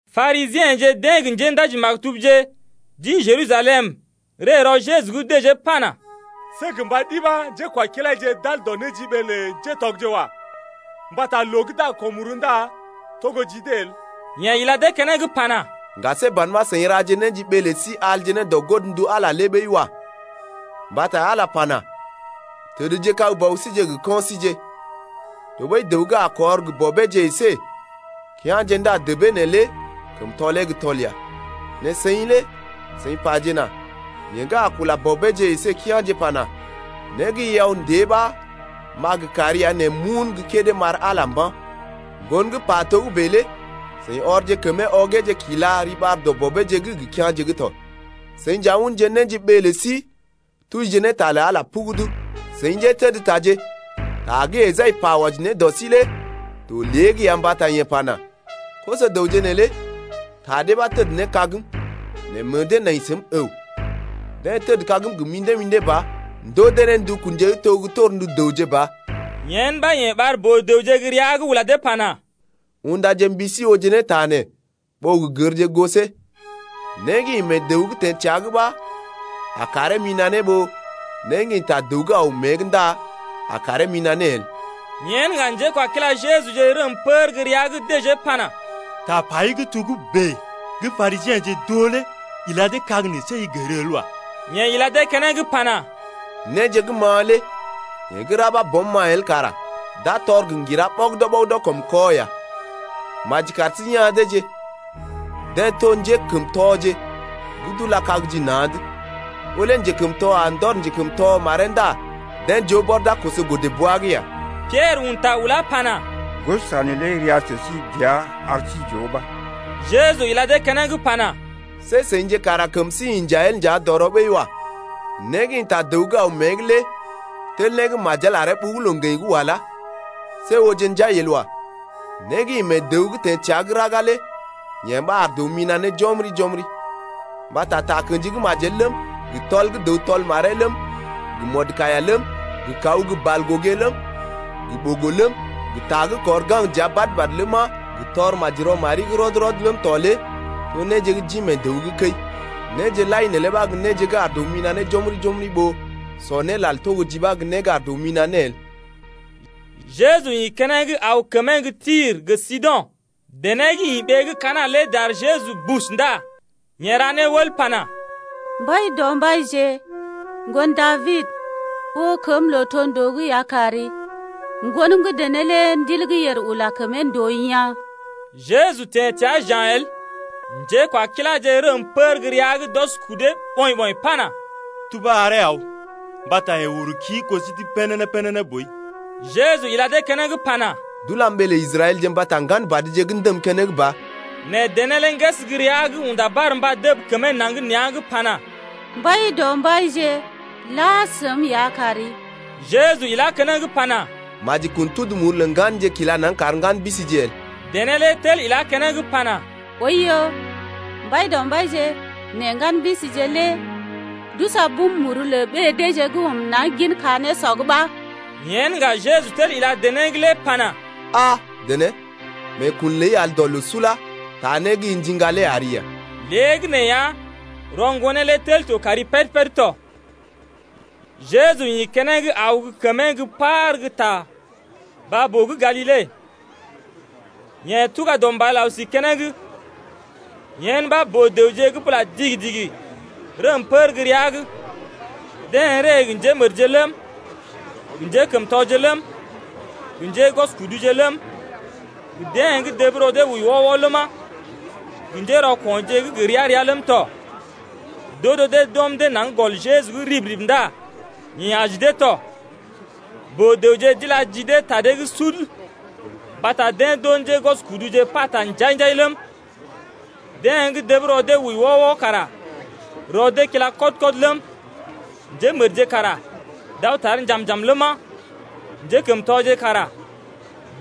Parisiḛje deḛ gə njéndaji-maktubje d’ḭ Jerusalem ree rɔ Jeju’g dəjee pana: See gə mba ɗi ɓa njékwakilaije d’al dɔ néjiɓee lə ŋgatɔgje wa. Mbata loo gə́ d’a gə ko̰ muru ndá togo ji dee el. Yeḛ ila dee keneŋ pana: Ŋga see ban ɓa seḭ raje néjiɓee lə sí alje ne dɔ godndu Ala lé ɓəi wa. Mbata Ala lé pana: Təd kag bɔbije gə kɔinje. Tɔɓəi dəw gə́ a kɔr gə bɔbeeje əsé kea̰je ndá debee neelé kəm tɔlee gə́ tɔl ya. Nɛ seḭ lé seḭ pajena: Yeḛ gə́ a kula bɔbeeje əsé kea̰je pana: Né gə́ i aw ndée ɓa m’a gə kari ya nɛ m’un gə́ kédé m’ar Ala lé mba̰. Ŋgon pa togə́bè lé seḭ ɔrje kəmee ɔgeeje kila riɓar dɔ bɔbeeje’g gə kea̰je’g tɔ. Seḭ nja unje néjiɓee lə sí tujije ne ta lə Ala lé pugudu. Seḭ njétədtaje, ta gə́ Esai pa wɔji ne dɔ sí lé to lée’g ya mbata yeḛ pana: Koso-dəwje neelé ta dee ɓa deḛ təd ne kagm, Nɛ meḛ dee nai səm əw. Deḛ tədkagm gə mḭdé-mḭdé ba Ndoo dee ne ndukunje gə́ to gə́ torndu dəwje ba. Yen ɓa yeḛ ɓar boo-dəwje gə́ rəa’g lé ula dee pana: Undaje mbi sí ooje ne ta nee ɓó gə gərje gosee. Né gə́ ḭ mee dəw’g teḛ təa’g ɓa a karee mina̰ ne ɓó né gə́ ḭ ta dəw’g aw mée’g ndá a karee mina̰ ne el. Yen ŋga njékwakila Jejuje rəm pər gə́ rəa’g dəjee pana: Tapai gə́ togə́bè gə́ Parisiḛje d’oo lé ila dee kag nɛ see i gər el wa. Yeḛ ila dee keneŋ pana: Néje gə́ ma̰a lé yee gə́ ra ɓa Bɔm ma̰a el kara d’a tɔr gə ŋgira ɓɔgədɔ-ɓɔgədɔ kɔm kɔ ya. Maji kar sí ya̰ deeje. Deḛ to njékəmtɔje gə́ d’ula kag ji na̰’d. Ɓó lé njekəmtɔ a ndɔr njekəmtɔ maree ndá deḛ joo bɔr d’a koso godə-bwa’g ya. Piɛrə un ta ulá pana: Gosɔta neelé ria sə sí dəa ar sí j’oo ba. Jeju ila dee keneŋ pana: See seḭje kara kəm sí inja el nja dɔrɔ ɓəi wa. Né gə́ ḭ ta dəw’g aw mée’g lé tel né gə́ majel aree ɓugu loo-ŋgəḭ’g walá. See ooje njai el wa. Nɛ né gə́ ḭ mee dəw’g teḛ təa gə́ raga lé yee ɓa ar dəw mina̰ ne jɔmri-jɔmri. Mbata takə̰ji gə́ majel ləm, gə tɔl gə́ dəw tɔl maree ləm, gə mɔdkaiya ləm, gə kaw gə́ balgogé ləm, gə ɓogo ləm, gə ta gə́ kɔr gaŋg dəa badə-badə ləma, gə tɔr maji rɔ mari’g rɔd-rɔd ləm tɔ lé to néje d’ḭ mee dəw’g gə́ kəi. Néje lai neelé ɓa gə́ néje gə́ ar dəw mina̰ ne jɔmri-jɔmri ɓó sɔ né lal togo ji ɓa gə́ né gə́ ar dəw mina̰ ne el. Jeju ḭ keneŋ aw kəmee gə́ Tir gə Sido̰. Dené gə́ ḭ ɓee gə́ Kana̰ lé dar Jeju bus ndá yeḛ ra ne wəl pana: Mbaidɔmbaije, ŋgon Dabid, oo kəm lootondoo’g ya kari. Ŋgonəm gə́ dené lé ndil gə́ yèr ula kəmee ndòo yaa̰. Jeju teḛ təa ja̰ el. Njékwakiláje rəm pər gə́ rəa’g d’ɔs kudee ɓɔḭ-ɓɔḭ pana: Tubá aree aw, mbata yeḛ uru kii goo sí’g pénéné-pénéné boi. Jeju ila dee keneŋ pana: D’ulam ɓee lə Israɛlje mbata ŋgan badje gə́ ndəm keneŋ ba. Nɛ dené lé ŋgəs gə́ rəa’g unda barmba dəb kəmee naŋg nea̰’g pana: Mbaidɔmbaije, la səm ya kari. Jeju ilá keneŋ pana: Maji kun tudu muru lə ŋganje kila naŋg kar ŋgan bisije el. Dené lé tel ilá keneŋ pana: Oiyo, Mbaidɔmbaije, nɛ ŋgan bisije lé d’usɔ bum muru lə ɓée deeje gə́ ɔm naŋg gin ka nésɔ’g ɓa Yen ŋga Jeju tel ila dené’g lé pana: Ah! dené, meekun ləi al dɔ loo sula, taa né gə́ i ndiŋga lé ari ya. Léegəneeya, rɔ ŋgonee lé tel to kari péd-péd tɔ. Jeju ḭ keneŋ aw gə́ kəmee gə́ par gə́ ta baa-boo gə́ Galile. Yeḛ tuga dɔ mbal aw si keneŋ. Yen ɓaa boo-dəwje gə́ bula digi-digi rəm pər gə́ rəa’g. Deḛ ree gə njémədje ləm, gə njékəmtɔje ləm, gə njégwɔskuduje ləm, gə deḛ gə́ dəb rɔ dee wəi wɔ-wɔ ləma, gə njérɔko̰je gə́ gə ria-ria ləm tɔ. D’odo dee d’ɔm dee naŋg gɔl Jeju’g rib-rib ndá yeḛ aji dee tɔ. Boo-dəwje d’ila ji dee ta dee’g sud mbata deḛ d’oo njégwɔskuduje pata njai-njai ləm, deḛ gə́ dəb rɔ dee wəi wɔ-wɔ kara rɔ dee kila kɔd-kɔd ləm, njémədje kara d’aw tar njam-njam ləma, njékəmtɔje nja kara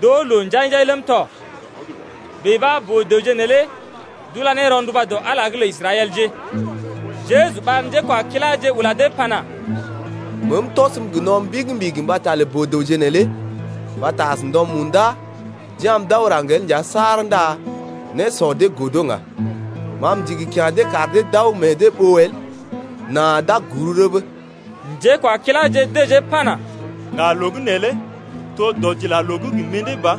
d’oo loo njai-njai ləm tɔ. Bèe ɓa boo-dəwje neelé d’ula ne rɔnduba dɔ Ala’g lə Israɛlje lé tɔ. Jeju ɓar njékwakiláje ula dee pana: Meem tɔsəm gə no̰ mbigi-mbigi mbata lə boo-dəwje neelé. Mbata as ndɔ munda d’ya̰’m d’aw raŋg el nja saar ndá nésɔ dee godo ŋga. Ma m’ndigi kya̰ dee kar dee d’aw meḛ dee ɓoo el nà d’a guru rəbə. Njékwakiláje dəjee pana, Ŋga loo gə́ neelé to dɔdilaloo’g gə mḭdé ba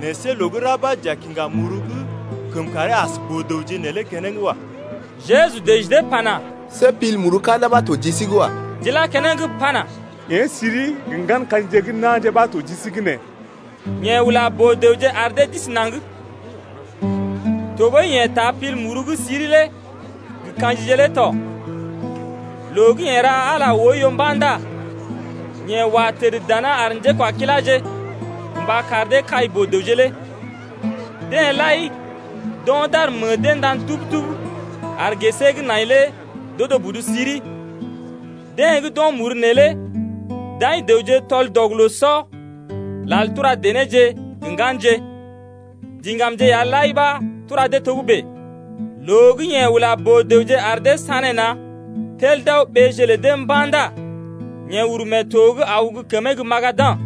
nɛ see loo gə́ ra ɓa j’a kiŋga muru gə́ kəm karee as boo-dəwje neelé keneŋ wa. Jeju dəji dee pana: See pil muru ka̰da ɓa to ji sí’g wa. D’ilá keneŋ pana: Yee siri gə ŋgan ka̰jije gə́ na̰je ɓa to ji sí’g nee. Yeḛ ula boo-dəwje ar dee d’isi naŋg. Tɔɓəi yeḛ taa pil muru gə́ siri lé gə ka̰jije lé tɔ. Loo gə́ yeḛ ra Ala oiyo mba̰ ndá yeḛ wa təd dana ar njékwakiláje gə mba kar dee kai boo-dəwje lé. Deḛ lai d’o̰ d’ar meḛ dee ndan tub-tub ar gesee gə́ nai lé d’odo budu siri. Deḛ gə́ d’o̰ muru neelé d’aḭ dəwje tɔl-dɔg-loo-sɔ, lal tura denéje gə ŋganje, diŋgamje ya lai ɓa tura dee togə́bè. Loo gə́ yeḛ ula boo-dəwje lé ar dee sanéna̰ tel d’aw ɓéeje lə dee mba̰ ndá yeḛ uru mee to’g aw gə́ kəmee gə́ Magada̰.